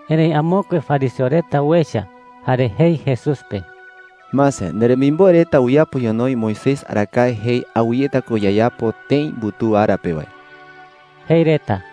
Erëi amokue fariseo reta uecha, jare jei Jesús pe: “Mase, nderemimboe reta uyapo ñonoï Moisés arakae jei awɨyeta ko yayapo tëi mbutuu ara pe wae,” jei reta.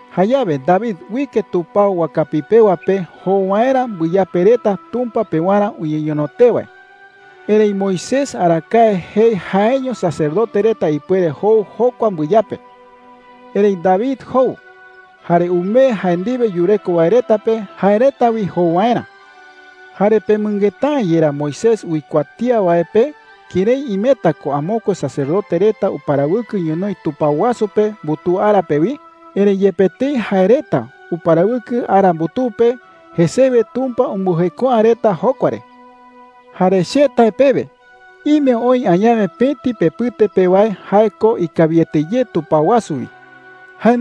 Jayawe David uike tupao wakapi pewa pe jou waerä mbɨyape reta Tumpa pewarä uñeñono tee wae. Erëi Moisés arakae jei jaeño sacerdote reta ipuere jou jokua mbɨyape. Erëi David jou, jare umee jae ndiwe yureko wae reta pe jae reta wi jou waerä,” jei chupe reta. “Jare ¿pemɨngeta’ä yerá Moisés uikuatía wae pe kërái imeta ko amokue sacerdote reta uparawɨkɨ ñonoï tupao wasu pe mbutuu ara pe wi? Erëi yepe tëi jae reta uparawɨkɨ ara mbutuu pe, jesewe Tumpa umbɨjeko’ä reta jokua re,” jei. “Jare che tae pewe, ime oï añawe pëti pepɨte pe wae jae ko ikawiete ye tupao wasu wi,” jei chupe reta.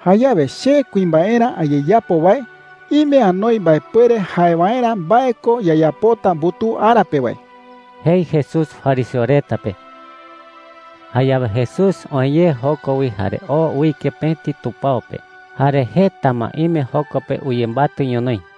“Jayawe che kuimbaerä ayeyapo wae ime anoi mbaepuere jae waerä mbae ko yayapota mbutuu ara pe wae,” jei Jesús fariseo reta pe. Jayawe Jesús oë ye joko wi jare oo uike pëti tupao pe. Jare jeta ma ime joko pe uyembatɨ ñonoï.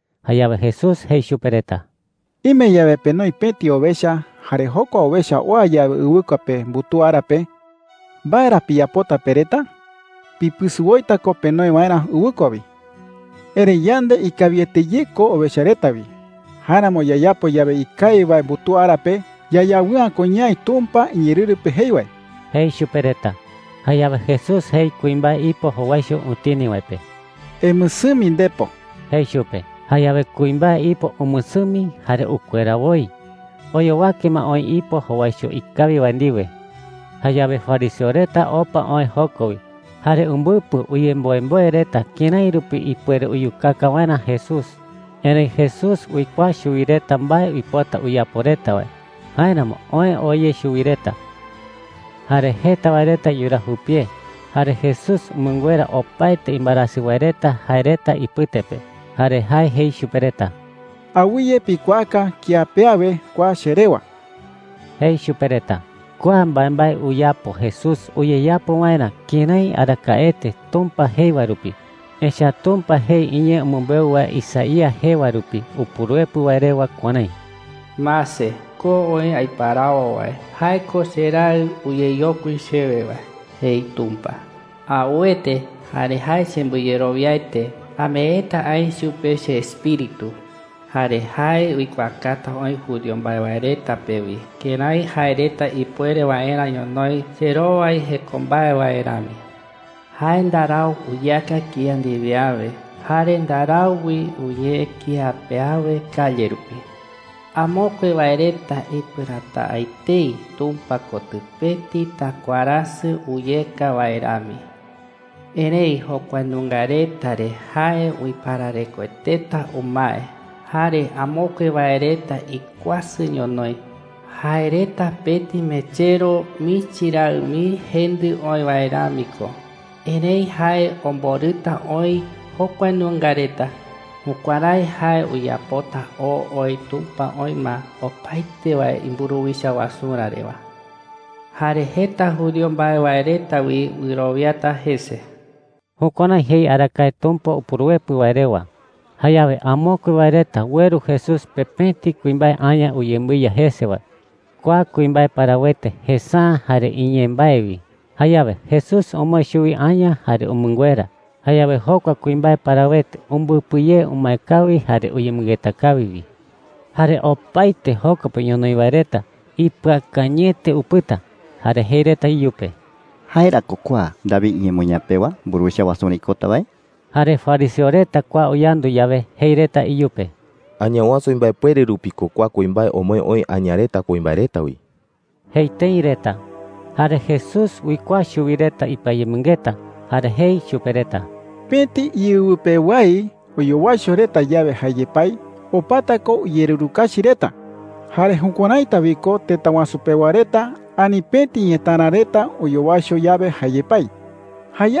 Jayawe Jesús jei chupe reta: “Ime yawe penoi pëti owecha, jare jokua owecha oa yawe ɨwɨkua pe mbutuu ara pe, ¿mbae ra piyapota pe reta? Pipɨsɨ woita ko penoe waerä ɨwɨkua wi,” jei. “Erëi yande ikawiete ye ko owecha reta wi. Jáeramo yayapo yawe ikawi wae mbutuu ara pe, yayawɨ'ä ko ñaï Tumpa iñeerɨru pe jei wae,” jei chupe reta. Jayawe Jesús jei kuimbae ipo jowaicho utini wae pe: “Emɨsɨmi ndepo,” jei chupe. Jayawe kuimbae ipo umɨsɨmi jare ukuera woi. Oyowake ma oï ipo jowaicho ikawi wae ndiwe. Jayawe fariseo reta opa oë joko wi, jare umbɨpɨ uyemboemboe reta kërái rupi ipuere uyukaka waerä Jesús. Erëi Jesús uikuaa chuwi reta mbae uipota uyapo reta wae; jáeramo oë oo ye chuwi reta. Jesús ko jae Tumpa uiparawo wae Jare jeta wae reta yuraa jupie, jare Jesús umɨnguera opaete imbaerasɨ wae reta jae reta ipɨte pe. Jare jae jei chupe reta: “Awɨye pikuaaka kía pe awe kua che rewa,” jei chupe reta. Kua mbaembae uyapo Jesús uyeyapo waerä kërái arakaete Tumpa jei wae rupi. Echa’ä Tumpa jei iñee umɨmbeu wae Isaías jee wae rupi Upuruepɨ wae rewa kuärái: “Mase, ko oï aiparawo wae. Jae ko cheraɨ uyeyokui chewe wae,” jei Tumpa. “Auete, jare jae chembɨyerowiaete. Ameeta aï chupe cheEspíritu, jare jae uikuaakata oï judío mbae wae reta pe wi kërái jae reta ipuere waerä ñonoï cherowai jeko mbae wae rami. Jae ndarau uyeaka kía ndiwe awe, jare ndarau wi uñee kía pe awe calle rupi. Amokue wae reta ipɨräta’ä etei Tumpa kotɨ pëti takuaräsɨ uyeka wae rami. Erëi jokua nunga reta re jae uipararekoeteta umae. Jare amokue wae reta ikuasɨ ñonoï. Jae reta pëti mechero michi raɨ mii jendɨ oï wae rami ko. Erëi jae omborɨta oï jokua nunga reta. Jukuärái jae uyapota oo oï Tumpa oï ma opaete wae imburuwicha wasurä rewa. Jare jeta judío mbae wae reta wi wɨrowiata jese.” Jukuärái jei arakae Tumpa Upuruepɨ wae rewa. Jayawe amokue wae reta ueru Jesús pe pëti kuimbae aña uyembɨiya jese wae. Kua kuimbae parawete jesa’ä jare iñee mbae wi. Jayawe Jesús omoë chuwi aña jare umɨnguera. Jayawe jokua kuimbae umbɨpɨ ye umae kawi jare uyemɨngeta kawi wi. Jare opaete joko pe ñonoï wae reta ipɨakañɨete upɨta, jare jei reta iyupe: “¿Jae ra ko kua David iñemoñaa pewa mburuwicha wasurä ikota wae?” Jare fariseo reta kua uyandu yawe, jei reta iyupe: “Añawasu Jae ko “Beelzebú” jae reta iñee pe. imbaepuere rupi ko kua kuimbae omoë oï aña reta kuimbae reta wi,” jei tëi reta. Jare Jesús uikuaa chuwi reta ipɨayemɨngeta, jare jei chupe reta: “Pëti iɨwɨ pewái oyowaicho reta yawe jae yepái, opata ko uyererukachi reta. Jare jukuäraita wi ko tëta wasu pewa reta ani pëti ñetära reta oyowaicho yawe jae yepái,” jei.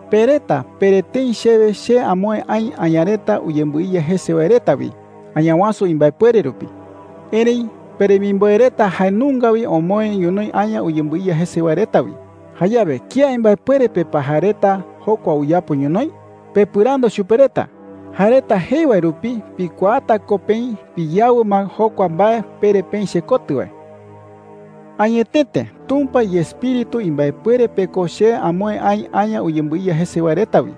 “Pe reta pere tëi chewe che amoë aï aña reta uyembɨiya jese wae reta wi Añawasu imbaepuere rupi. Erëi peremimboe reta jae nunga wi omoë ñonoï aña uyembɨiya jese wae reta wi. Jayawe, ¿kía imbaepuere pe pa jae reta jokua uyapo ñonoï? Pepɨrandu chupe reta. Jae reta jei wae rupi pikuaata ko peï piyawɨ ma jokua mbae pere peï chekotɨ wae,” jei chupe reta. “Añetete Tumpa iEspíritu imbaepuere pe ko che amoë aï aña uyembɨiya jese wae reta wi.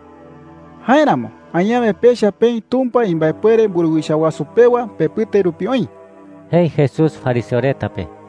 Jáeramo añawe pecha peï Tumpa imbaepuere mburuwicha wasu pewa pepɨte rupi oï,” jei Jesús fariseo reta pe.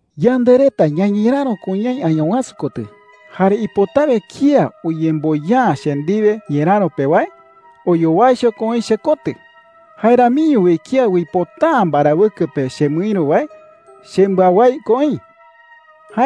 “Yande reta ñañeräro ko ñaï Añawasu kotɨ. Jare ipotawe kía uyemboya’ä che ndiwe ñeräro pe wae, oyowaicho ko oï chekotɨ. Jae ramiño wi kía uipota’ä mbarawɨkɨ pe chemɨïru wae, chembɨawái ko oï,” jei chupe reta.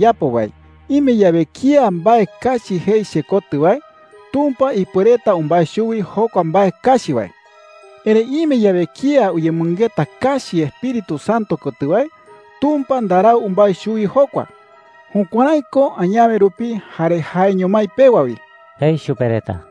“Jare che kuimbaerä ayeyapo wae, ime yawe kía mbae kachi jei chekotɨ wae, Tumpa ipuereta umbái chuwi jokua mbae kachi wae. Erëi ime yawe kía uyemɨngeta kachi Espíritu Santo kotɨ wae, Tumpa ndarau umbái chuwi jokua. Jukuärái ko añawe rupi jare jaeño mái pewa wi,” jei chupe reta.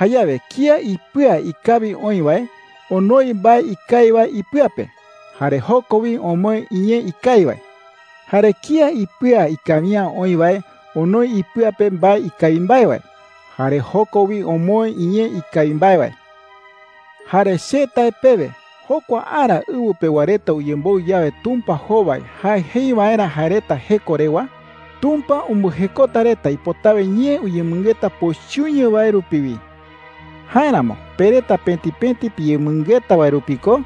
“Jayawe kía ipɨa ikawi oï wae onoi mbae ikawi wae ipɨa pe, jare joko wi omoë iñee ikawi wae,” jei. “Jare kía ipɨa ikawi’ä oï wae onoi ipɨa pe mbae ikawi mbae wae, jare joko wi omoë iñee ikawi mbae wae,” jei chupe reta. “Jare che tae pewe jokua ara ɨwɨ pewa reta uyemboɨ yawe Tumpa jowai jae jei waerä jae reta jeko rewa, Tumpa umbɨjekota reta ipotawe ñee uyemɨngeta pochɨño wae rupi wi. Jáeramo pe reta pëti pëti piyemɨngeta wae rupi ko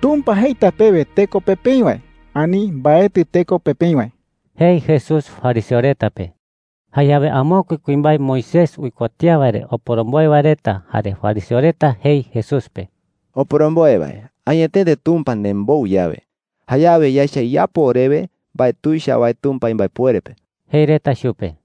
Tumpa jeita pewe teko pe peï wae, ani mbaetɨ teko pe peï wae,” jei Jesús fariseo reta pe. Jayawe amokue kuimbae Moisés uikuatía wae re oporomboe wae reta jare fariseo reta jei Jesús pe: “Oporomboe wae, añetete Tumpa nembou yawe, jayawe yaecha iyapo orewe mbae tuicha wae Tumpa imbaepuere pe,” jei reta chupe.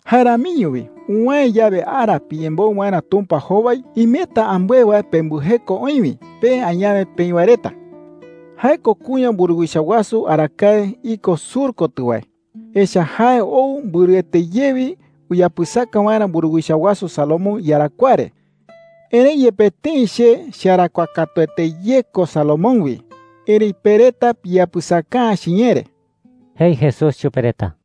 “Jae ramiño wi, uwäe yawe ara piyemboɨ waerä Tumpa jowai, imeta ambɨe wae pembɨjeko oï wi, pe añawe peï wae reta,” jei chupe reta. “Jae ko kuña mburuwicha wasu arakae iko sur kotɨ wae. Echa’ä jae ou mbɨrɨete ye wi uyapɨsaka waerä mburuwicha wasu Salomón iyarakuaa re. Erëi yepe tëi che chearakuaa katuete ye ko Salomón wi, erëi pe reta piyapɨsaka’ä chiñee re,” jei Jesús chupe reta.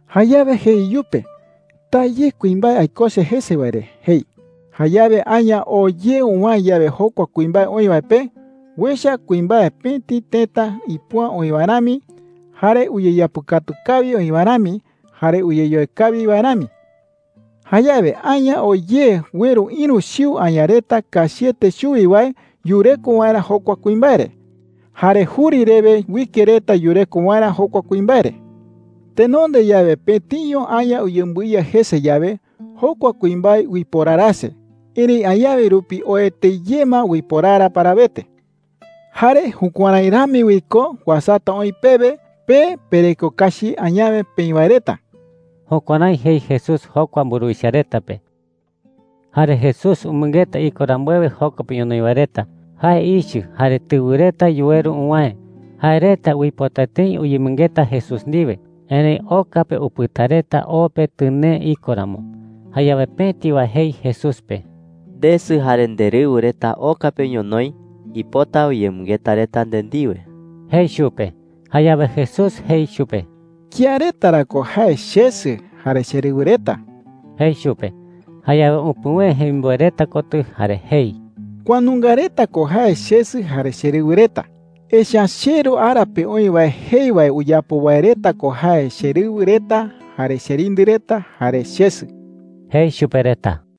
Jayawe jei iyupe: ‘Taa ye kuimbae aikose jese wae re,’ jei. Jayawe aña oo ye uwäe yawe jokua kuimbae oï wae pe, uecha kuimbae pëti tëta ipo’ä oï wae rami, jare uyeyapɨkatu kawi oï wae rami, jare uyeyoe kawi wae rami,” jei. “Jayawe aña oo ye ueru ïru chiu aña reta kachiete chuwi wae yureko waerä jokua kuimbae re. Jare juri rewe uike reta yureko waerä jokua kuimbae re,” jei. “Tenonde yawe, pëtiño aña uyembɨiya jese yawe, jokua kuimbae uiporarase. Erëi añawe rupi oete ye ma uiporara parawete,” jei. “Jare jukuärái rami wi ko uasata oï pewe, pe pereko kachi añawe peï wae reta.” Jukuärái jei Jesús jokua mburuwicha reta pe. Jare Jesús umɨngeta iko rambuewe joko pe ñonoï wae reta, jae ichɨ jare tɨwɨ reta yuweru uwäe. Jae reta uipota tëi uyemɨngeta Jesús ndiwe, erëi oka pe upɨta reta o pe tɨnee iko ramo. Jayawe pëti wae jei Jesús pe: “Ndesɨ jare nderɨwɨ reta oka pe ñonoï. Uipota uyemɨngeta reta nde ndiwe,” jei chupe. Jayawe Jesús jei chupe: “¿Kía reta ra ko jae chesɨ jare cherɨwɨ reta?” jei chupe. Jayawe upuwëe jemimboe reta kotɨ, jare jei: “Kua nunga reta ko jae chesɨ jare cherɨwɨ reta. Echa’ä cheRu ara pe oï wae jei wae uyapo wae reta ko jae cherɨwɨ reta jare cherindɨ reta jare chesɨ,” jei chupe reta.